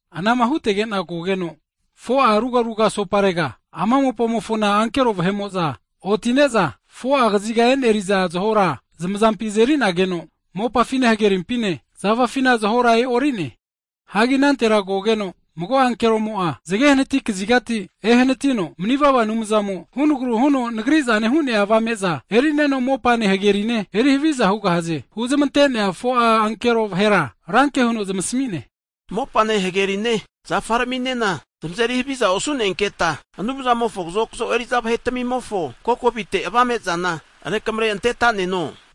Anama hutegena kogeno, 4'a rugaraga asoparega ama mopamofona ankero vahe'mo'za otine'za, 4'a kaziga e'neria zahora zmazampi azerinageno, mopafine hagerimpine, zafafinena zahora e'orine. Hagi anantera kogeno mago ankeromo'a zage hanati kazigati ehanatino, manivava Anumzamo hunagru huno nagrizane hu'nea avame'za, erineno mopane hagerine eri haviza hugahaze huzmante'nea 4'a ankero vahera ranke huno zmasamine. Mopane hagerine, zafaraminena zmazeri haviza osu'nenketa, Anumzamofo kazokzo eriza vahetamimofo kokovite avame'zana rekamre antetaneno hu'ne.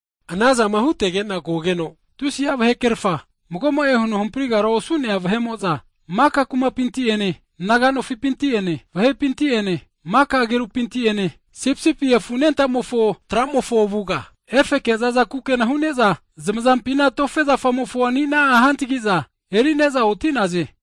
Anazama hutegena kogeno, tusi'a vahekrefa mago'mo'e huno hamprigara osu'nea vahe'mo'za maka kumapinti ene, naga nofipinti ene, vahepinti ene, maka agerupinti ene, Sipisipi Afu Anentamofo tra'mofo avuga, efeke zaza kukena hu'ne'za, zmazampina tofe zafamofo ani'na hantagi'za erine'za oti'naze.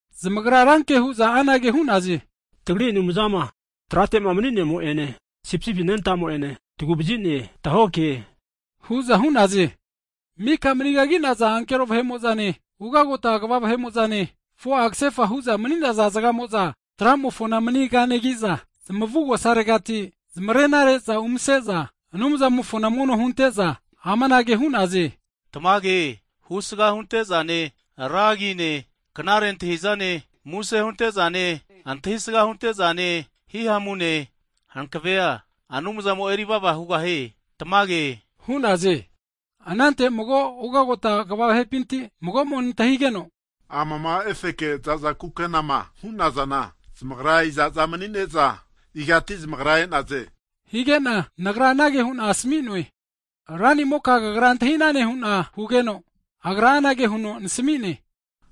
Zamagra ranke hu'za anage hu'naze, tagri Anumzama tratema mni'nemo ene, Sipisipi anentamo'ene, tagu'vazine tahokehena'e hu'za hu'naze. Mika manigagi'naza ankero vahe'mo'zane, ugagota kva vahe'mo'zane, 4'a kasefa hu'za mni'naza zgamo'za, kini tramofona manikanegi'za zmavugosaregati zmarenare'za umase'za, Anumzamofona mono hunte'za, amanage hu'naze, tamage, husgama huntezane, ra agine, knare antahizane, muse huntezane, antahisga huntezane, hihamune hankavea Anumzamo eri vava hugahie tamage hu'naze! Anante 24'a ugagota kva vahepinti mago'mo nantahigeno, amama efeke zaza kukenama hu'nazana, zamagra iza'za mni'ne'za, igati zmagra e'naze? Hige'na, nagra anage hu'na asami'noe, Ranimoka kagra antahinane hu'na hugeno, Agra anage huno nasami'ne,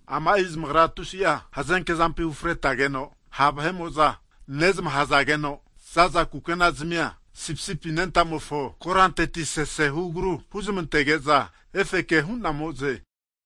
ama'i zmagra tusi'a hazenkezampi ufretageno ha' vahe'mo'za nezamahazageno, zaza kukenazamia Sipisipi Anentamofo koranteti sese hugaru huzmantageza efeke hu'namoze.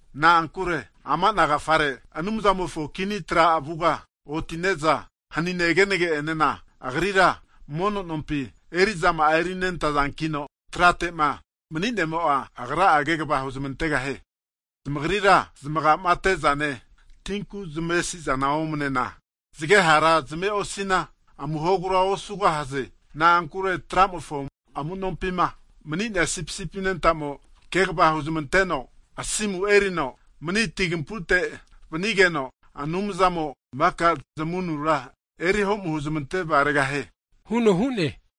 Na'ankure ama ana agafare, Anumzamofo kini tra avuga oti'ne'za hanine zgenena Agri ra mono nompi eri'zama'a erinentazankino, tratema mni'nemo'a, Agra kegva huzmantegahie. Zamagrira zmagamate'zane, tinku zmavesizane omnena, zge hara zmave'osina, amuhogura osugahaze. Na'ankure tra'mofo amunompima mni'nea Sipisipi anentamo, kegva huzmanteno asimu erino mni tinkapuite vanigeno, Anumzamo maka zamavunura eri homu huzmante vgaregahie huno hu'ne.